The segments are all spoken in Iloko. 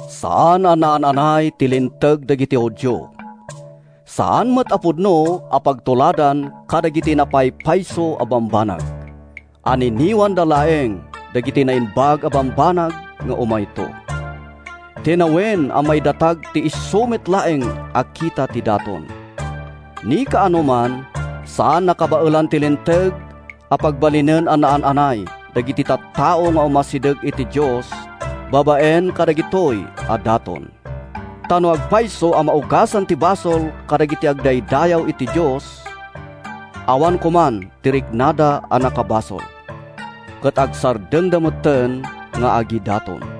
Saan a naan-anay ti Linteg dagiti Judio; saan met a pudno a pagtuladan kadagiti napaypayso a bambanag. Anniniwanda laeng dagiti naimbag a bambanag nga umayto. Tinawen a maidatag ti isu met laeng a kita ti daton. Ni kaanoman saan a kabaelan ti Linteg a pagbalinen a naan-anay dagiti tattao nga umasideg iti Dios babaen kadagitoy a daton. Ta no agpayso a maugasan ti basol dagiti agdaydayaw iti Dios, awan koman ti riknada a nakabasol, ket agsardengda metten nga agidaton.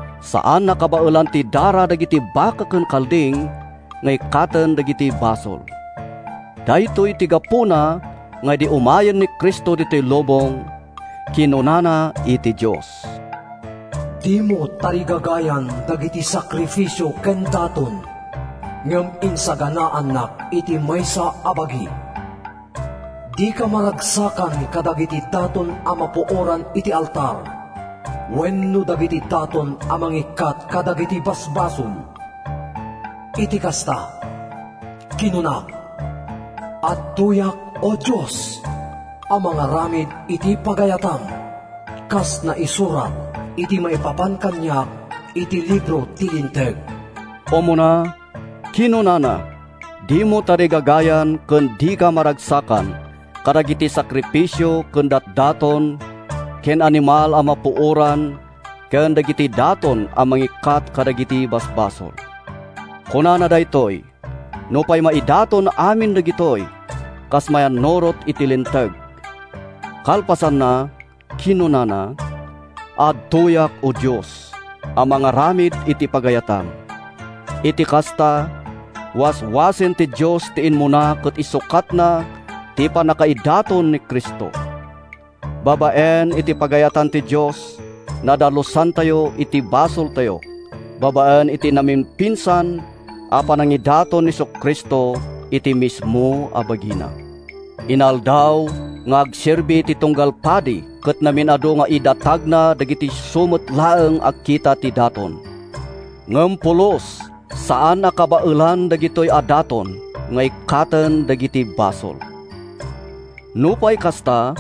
Saan a kabaelan ti dara dagiti baka ken kalding nga ikkaten dagiti basol. Daytoy ti gapuna nga idi umayen ni Cristo ditoy lubong, kinunana iti Dios: “Dimo tarigagayan dagiti sakrifisio ken daton, ngem insaganaannak iti maysa a bagi. Dika maragsakan kadagiti daton a mapuoran iti altar, wenno dagiti daton a mangikkat kadagiti basbasol. Iti kasta, kinunak, ‘Adtoyak, O Dios, a mangaramid iti pagayatam, Kas naisurat iti maipapan kaniak iti libro ti Linteg.’” Umuna, kinunana, “Dimo tarigagayan ken dika maragsakan kadagiti sakrifisio ken datdaton ken animal a mapuoran iti altar ken kadagiti daton a mangikkat kadagiti basbasol.” Kunana daytoy nupay maidaton amin dagitoy kas mayannurot iti Linteg. Kalpasanna, kinunana, “Adtoyak, O Dios, a mangaramid iti pagayatam.” Iti kasta, waswasen ti Dios ti immuna ket insukatna ti pannakaidaton ni Cristo! Babaen iti pagayatan ti Dios, nadalusantayo iti basoltayo babaen iti namimpinsan a panangidaton ni Jesu-Cristo iti mismo a bagina. Inaldaw nga agserbi ti tunggal padi ket mamin-adu nga idatagna dagiti isu met laeng a kita ti daton. Ngem pulos a saan a kabaelan dagitoy a daton nga ikkaten dagiti basol. Nupay kasta,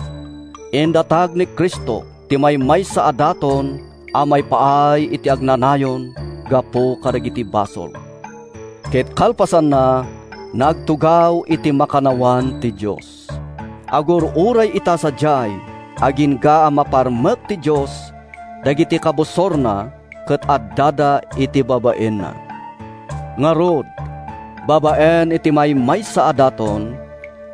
indatag ni Cristo ti maymaysa a daton a maipaay iti agnanayon gapu kadagiti basol, ket kalpasanna, nagtugaw iti makannawan ti Dios. Agur-uray ita sadiay agingga a maparmek ti Dios dagiti kabusorna ket addada iti babaenna. Ngarud, babaen iti maymaysa a daton,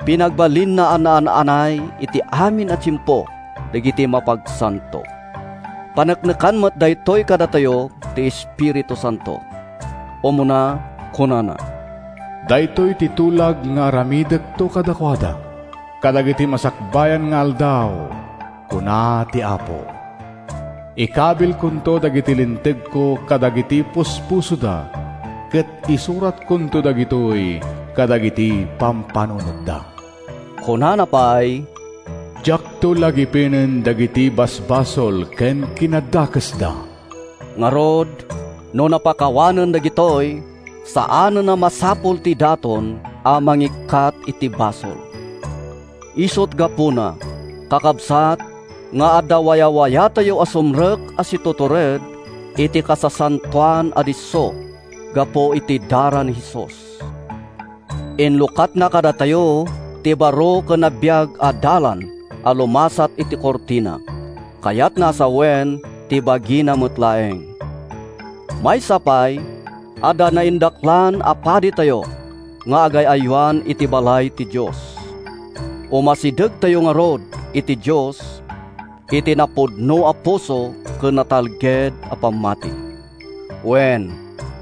pinagbalinna a naan-anay iti amin a tiempo dagiti mapagsanto. Paneknekan met daytoy kadatayo ti Espiritu Santo. Umuna, kunana: “Daytoy ti tulag nga aramidekto kadakuada, Kadagiti masakbayan nga aldaw, kuna ti Apo: Ikabilkonto dagiti lintegko kadagiti puspusoda, Ket isuratkonto dagitoy kadagiti pampanunotda.” Kunana pay, “Diakto lagipenen dagiti basbasol ken kinadakesda.” Ngarud, no napakawanen dagitoy, saanen a masapul ti daton a mangikkat iti basol. Isut’ gapuna, kakabsat, nga adda wayawayatayo a sumrek a situtured iti Kasasantoan a Disso gapu iti dara ni Jesus. Inlukatna kadatayo ti baro ken nabiag a dalan a lumasat iti kurtina, kayatna a sawen, ti bagina met laeng. Maysa pay, adda naindaklan a paditayo nga agay-aywan iti balay ti Dios. Umasidegtayo ngarud iti Dios iti napudno a puso ken natalged a pammati. Wen,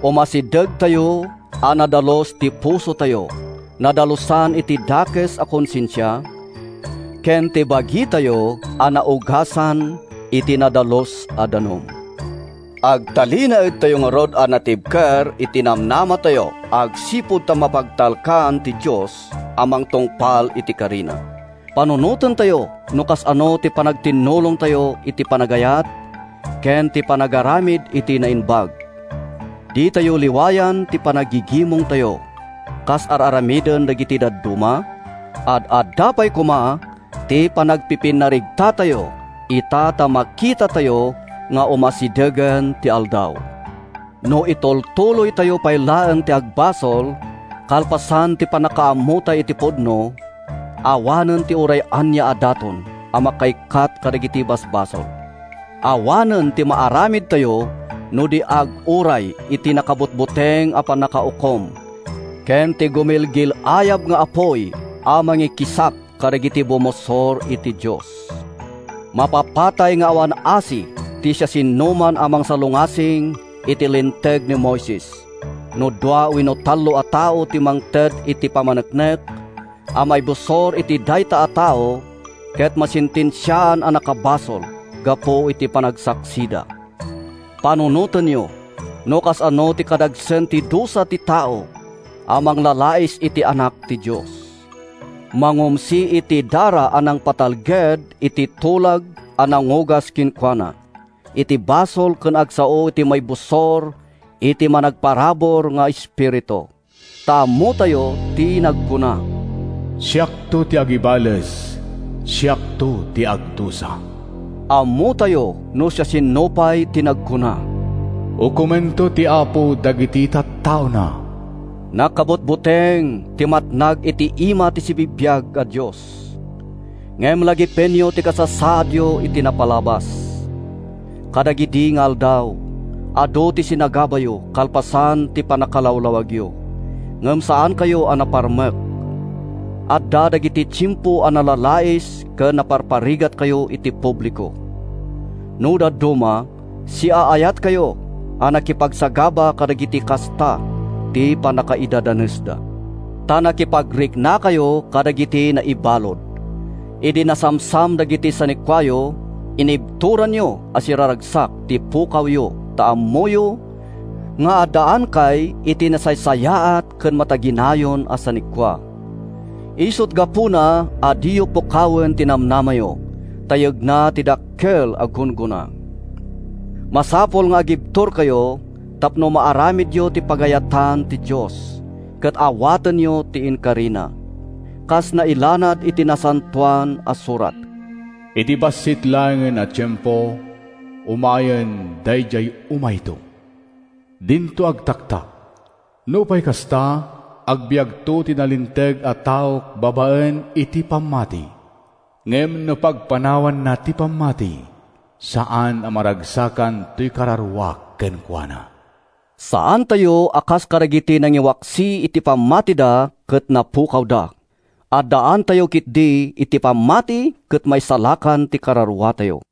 umasidegtayo a nadalus ti pusotayo—nadalusan iti dakes a konsensia—ken ti bagitayo a naugasan iti nadalus a danum. Agtalinaedtayo ngarud a natibker iti namnamatayo agsipud ta mapagtalkan ti Dios a mangtungpal iti karina. Panunotentayo no kasano ti panagtitinnulongtayo iti panagayat ken panagaramid iti naimbag. Ditayo liwayan ti panaggigimongtayo, kas ar-aramiden dagiti dadduma. Ad-adda pay koma ti panagpipinnaregtatayo, ita ta makitayo nga umasidegen ti Aldaw. No itultuloytayo pay laeng ti agbasol kalpasan ti pannakaammotay iti pudno, awanen ti uray ania a daton a makaikkat kadagiti basbasol. Awanen ti maaramidtayo no di aguray iti nakabutbuteng a pannakaukom ken ti gumilgil-ayab nga apuy a mangikisap kadagiti bumusor iti Dios. Mapapatay nga awan asi ti siasinoman a mangsalungasing iti Linteg ni Moises no dua wenno tallo a tattao ti mangted iti pammaneknek a maibusor iti dayta a tao ket masentensiaan a nakabasol gapu iti panagsaksida. Panunotenyo no kasano ti kadagsen ti dusa ti tao a manglalais iti Anak ti Dios, mangumsi iti dara a nangpatalged iti tulag a nangugas kenkuana iti basol ken agsao iti maibusor iti managparabur nga Espiritu! Ta ammotayo ti nagkuna, “Siakto ti agibales, siakto ti agdusa.” Ammotayo no siasino pay ti nagkuna, “Ukomento ti Apo dagiti tattaona.” Nakabutbuteng ti matnag iti ima ti sibibiag a Dios. Ngem lagipenyo ti kasasaadyo iti napalabas. Kadagidi nga aldaw, adu ti sinagabayo kalpasan ti pannakalawlawagyo, ngem saankayo a naparmek. Adda dagidi tiempo a nalalais ken naparparigatkayo iti publiko. No dadduma, siaayatkayo a nakipagsagaba kadagiti kasta ti pannakaidadanesda. Ta nakipagriknakayo kadagiti naibalud. Idi nasamsam dagiti sanikuayo, inibturanyo a siraragsak ti pukawyo ta ammoyo nga addaankay iti nasaysayaat ken mataginayon a sanikua. Isut’ gapuna a diyo pukawen ti namnamayo, ta yegna ti dakkel a gunggona. Masapul nga agibturkayo tapno maaramidyo ti pagayatan ti Dios, ket awatenyo ti inkarina. Kas nailanad iti Nasantoan a Surat, “Iti bassit laengen a tiempo, Umayen daydiay umayto; dinto agtaktak. Nupay kasta, agbiagto ti nalinteg a taok babaen iti pammati; ngem no pagpanawanna ti pammati, saan a maragsakan ’toy kararuak kenkuana.” Saantayo a kas kadagiti nangiwaksi iti pammatida ket napukawda. Addaantayo ketdi iti pammati ket maisalakan ti kararuatayo.